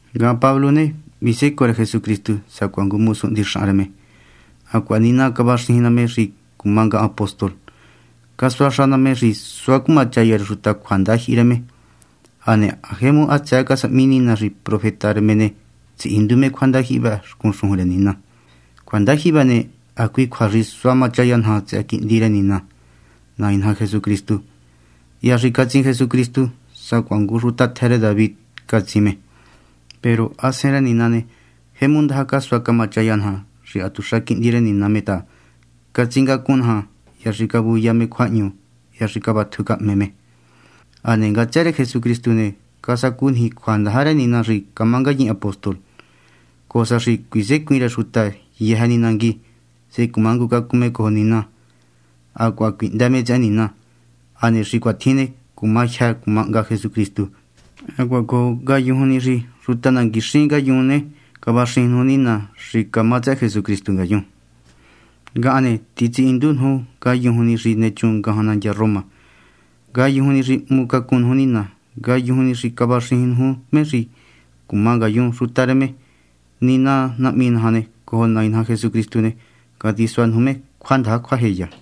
Ngahan, Pablo ne, visécoo rë Jesucristu sacuaha ngu mosu hndixahan rë me, hacuaha Nina cavaxijin ná me xi cuma ngahan apóstol, casuaxa ná me xi suá cumachaya rë xuta cjuandajyihi rë me. Hane ha jemu hatsëë casahmi Nina xi profeta rë me ne, tsihindu me cjuandajyihi vë xcun xujun rë Nina. Cjuandajyihi vë ne, hacui cjua xi sua machaya naja tsëhë Quihndi rë Nina, Nai naja Jesucristu. Hya xi catsin Jesucristu, sacuaha ngu xuta tjë rë David, catsin me. Peru Hasen rë Nina ne, jemu ndaja casua camachaya naja xi hatuxa Quihndi rë Nina me ta catsingacun naja hya xi cavuya me cjuahñu hya xi cavatju cahme me. Hane ngatsë rë Jesucristu ne, casacu niji cjuandaja rë Nina xi camá ngayin apóstol, cojo sa xi cuisecuin rë xuta yëjë ni nangui, sehe cumangucacun me cojo Nina hacuaha cuihndë me tsëhë Nina. Hane xi cuatjin ne, cuma jyë cuma hnga Jesucristu. Hacuaha cojo ngayujun ni xi xuta nanguixin ngayun ne, cavaxijin nuju Nina xi camá tsëhë Jesucristu ngayun. Ngahan ne, titsihíndu nuju ngayujun ni xi nechun ngajan nandya Roma, ngayujun ni xi hmucacun nuju Nina, ngayujun ni xi cavaxijin nuju me xi camá ngayun xuta rë me. Nina Nahmi naja cojo Nai naja Jesucristu ne, catisua nuju me cjuandaja cjuajeya.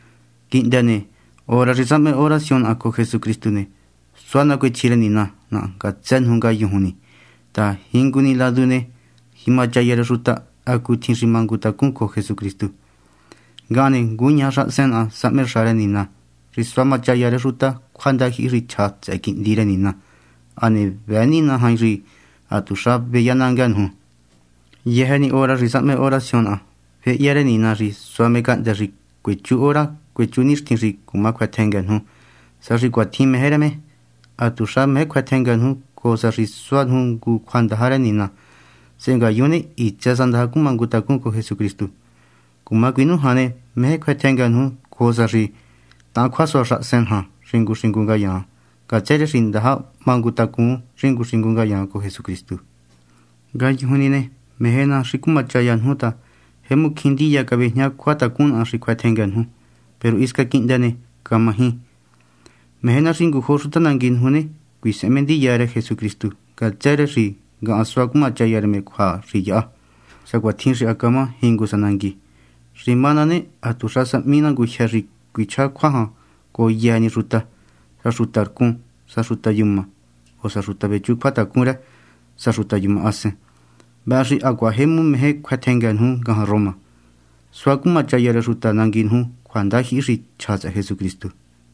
Quihndë ne, hora xi sahme oración naha cojo Jesucristu ne, suá nacuechji rë Nina naha ngatsë nuju ngayujun ni ta jingu ni ladu ne, jimachaya rë xuta hacutjin xi mangutacún cojo Jesucristu. Ngahan ne, nguñaja xahasen naha sahme xa rë Nina xi suá cumachaya rë xuta cjuandajyihi xi chja tsëhë Quihndi rë Nina. Hane vëë Nina jain xi hatuxa veyanangë nuju, yëjë ni hora xi sahme oración naha. Féhya rë Nina xi sua me cahndë́ xi cuechú hora cuechú nixtin xi cuma cjuëtjëngë nuju, sa xi cuatjin meje rë me. Hatuxa meje cjuëtjëngë nuju, cojo sa xi suá nuju ngu cjuandaja rë Nina. Sehe ngayun ne, hitsë sa ndaja cumangutacun cojo Jesucristu. Cuma cuinújan ne, meje cjuëtjëngë nuju, cojo sa xi tahan cjuasua xahasen naja xingu xingu ngayaan, ngatsë rë xi ndaja mangutacun xingu xingu ngayaan cojo Jesucristu. Ngayujun ni ne, meje ná xi cumachaya nuju ta jemu cjín ndiya cavejñá cjuatacun naha xi cjuëtjëngë nuju, peru hisca quihndë ne, camaji. Meje ná xi ngujo xuta nangui nuju ne, cuisehen me ndiya rë Jesucristu ngatsë rë xi ngahan suá cumachaya rë me cjua xi yahá, sacuatjin xi ha camá jingu sa nangui. Xi má na ne, hatuxa sahmi ná ngujyë xi cuichjá cjua jan cojo yëjë ni xuta; sa xuta rcun, sa xuta yuma; o sa xuta vechu cjuatacun rë, sa xuta yuma hasen. Vëhë xi hacuaha jemu meje cjuëtjëngë nuju ngajan Roma, suá cumachaya rë xuta nangui nuju cjuandajyihi xi chja tsëhë Jesucristu.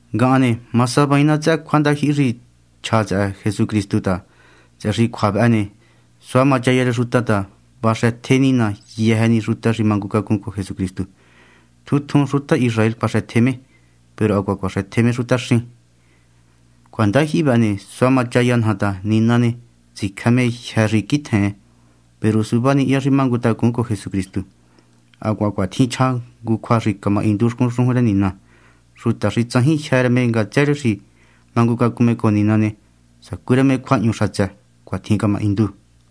Ngahan ne, ma savaain ná tsëhë cjuandajyihi xi chja tsëhë Jesucristu ta, tsëhë xi cjua vëhë ne, sua machaya rë xuta ta vaxëtje Nina yëjë ni xuta xi mangucacun cojo Jesucristu. Tjun tjun xuta Israel cuaxëtje me, peru hacuaha cuaxëtje me xutaxín. Cjuandajyihi vëhë ne, sua machaya naja ta Nina ne, tsicjë me jyë́ xi quitjen, peru suvá ni hya xi mangutacun cojo Jesucristu. Hacuaha cuatjin chja ngu cjua xi camahindu xcun xujun rë Nina: “Xuta xi tsajin jyë́ rë me ngatsë rë xi mangucacun me cojo Nina ne, sacú rë me cjuahñu xatsë.” Cuatjin camahindu.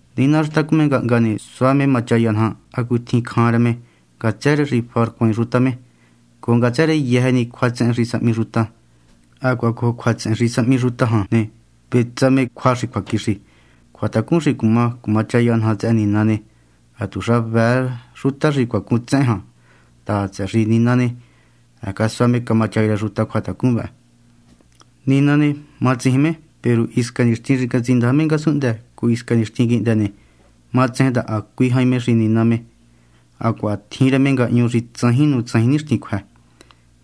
Nina xi tacun me ngahnga ne, sua me machaya naja hacutjin jemu cjan rë me ngatsë rë xi faharcuain xuta me, cojo ngatsë rë yëjë ni cjuatsehen xi sahmi xuta. Hacuaha cojo cjuatsehen xi sahmi xuta jan ne, vetsa me cjua xi cjuaquixi. Cjuatacun xi cuma cumachaya naja tsëhë Nina ne, hatuxa vëë xuta xi cuacun tsehen jan ta, tsëhë xi Nina ne, ha casua me camachaya rë xuta cjuatacun vëhë. Nina ne, matsijin me; peru hisca nixtin xi catsindaja me ngasunhndë cojo hisca nixtin quihndë ne, matsejen ta hacui jain me xi Nina me hacuaha tjin rë me ngahñu xi tsajin nuju tsajin nixtin cjuë.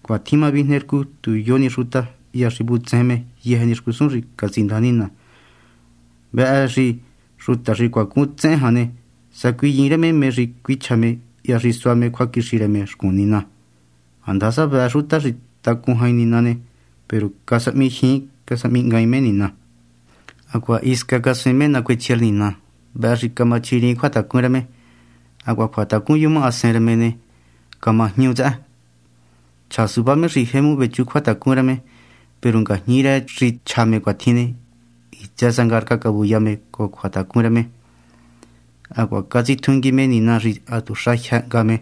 Cuatjin ma vijne rcu tu yo ni xuta hya xi vutsejen me yëjë ni xcusun xi catsindaja Nina. Vëhë xi xuta xi cuacun tsehen jan ne, sacuiyiin rë me mé xi cuichja me hya xi sua me cjuaquixi rë me xcun Nina. Handasa vëë xuta xi tacun jain Nina ne, peru casahmijyiin casahmihngaain me Nina, hacuaha hisca casuaain me nacuechji rë Nina. Vëhë xi camachjiriin cjuatacun rë me. Hacuaha cjuatacun yuma hasen rë me ne, camajñu tsëhë. Chja suvá me xi jemu vechu cjuatacun rë me, peru ngajñi rë xi chja me cuatjin ne, hitsë sa ngarca cavuya me cojo cjuatacun rë me. Hacuaha catsitjungui me Nina xi hatuxa jyë hnga me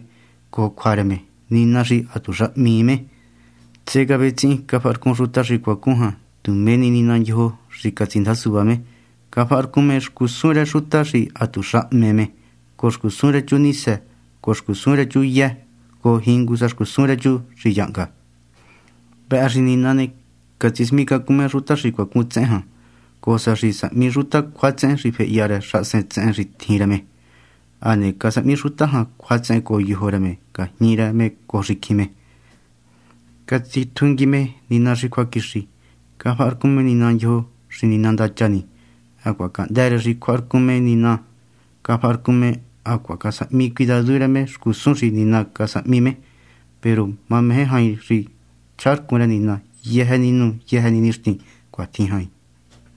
cojo cjua rë me, Nina xi hatuxa hmii me. Sehe cavetsihin cafaharcun xuta xi cuacun jan tu mé ni nina ndyojo xi catsindaja suvá me. Cafaharcun me xcusun rë xuta xi hatuxa hme me, cojo xcusun rë chu nisë, cojo xcusun rë chu yë, cojo jingu sa xcusun rë chu xi yahnga. Vëhë xi Nina ne, catsismicacun me xuta xi cuacun tsehen jan, cojo sa xi sahmi xuta cjuatsehen xi fehya rë xahasen tsehen xi tjin rë me. Hane casahmi xuta jan cjuatsehen cojo yojo rë me ngajñi rë me cojo xicjin me. Catsitjungui me Nina xi cjuaquixi. Cafaharcun me nina ndyojo xi nina ndacha ni. Hacuaha cahndë́ rë xi cjuaharcun me Nina, cafaharcun me hacuaha casahmi cuidadu rë xcusun xi Nina casahmi me. Peru mameje jain xi chjaharcun rë Nina yëjë ni nu yëjë ni nixtin. Cuatjin jain.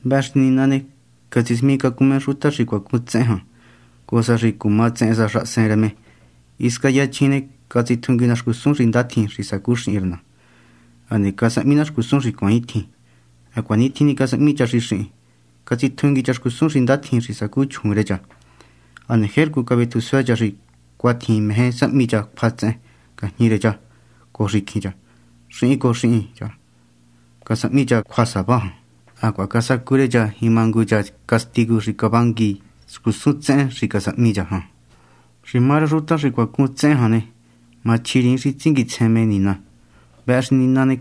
Vëhë xi Nina ne, catsismicacun me xuta xi cuacun tsehen jan, cojo sa xi cuma tsehen sa xahasen rë me. Hisca yachjin ne, catsitjungui ne xcusun xi ndatjin xi sacú xihin rë ne, hane casahmi na xcusun xi cuaaintjin. Hacuaintjin ni casahmi cha xi xihin; catsitjungui cha xcusun xi ndatjin xi sacu chjuun rë cha, hane jercu cavetju suë cha xi cuatjin meje sahmi cha cjuatsehen ngajñi rë cha cojo xicjin cha. Xihin cojo xihin cha casahmi cha cjuasava jan, hacuaha casacu rë cha jima ngu cha castigu xi cavangui xcusun tsehen xi casahmi cha jan. Xi má rë xuta xi cuacun tsehen jan ne, machjiriin xi tsinguitsjen me nina. Vëhë xi Nina ne,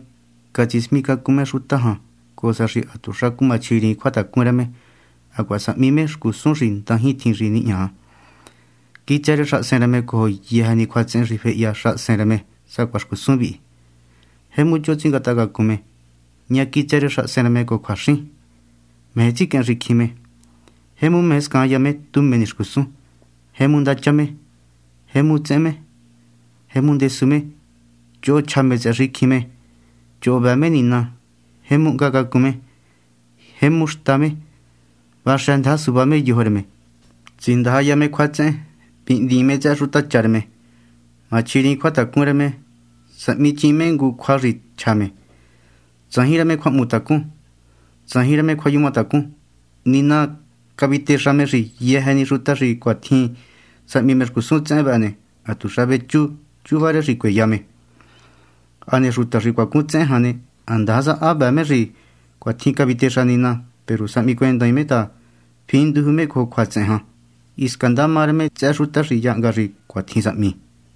catsismicacun me xuta jan, cojo sa xi hatuxa cumachjiriin cjuatacun rë me, hacuaha sahmi me xcusun xi ndajintjin xi nihña. Quitsë rë xahasen rë me cojo yëjë ni cjuatsehen xi fehya xahasen rë me sacuaha xcusun vi: jemu choho tsingatahacacun me; ña quitsë rë xahasen rë me cojo cjuaxin; meje tsiquehen xicjin me; jemu meje scaanya me tu mé ni xcusun; jemu ndacha me; jemu tsehen me; jemu ndesu me; choho chja me tsëhë xicjin me; choho vëë me Nina; jemu hnga cacun me; jemu xta me; vaxëndaja suvá me yojo rë me; tsindajaya me cjuatsehen; vihndiin me tsëhë xutacha rë me; machjiriin cjuatacun rë me; sahmiichiin me ngu cjua xi chja me; tsajin rë me cjuahmutacun; tsajin rë me cjuayumatacun. Nina ne, cavitexa me xi yëjë ni xuta xi cuatjin sahmi xcusun tsehen vë ne, hatuxa vechú chuva rë xi cueya me. Hane xuta xi cuacun tsehen jan ne, handasa ha vëë me xi cuatjin cavitexa Nina, peru sahmicuendaain me ta finduju me cojo cjuatsehen jan, hisca ndama rë me tsëhë xuta xi yahnga xi cuatjin sahmi.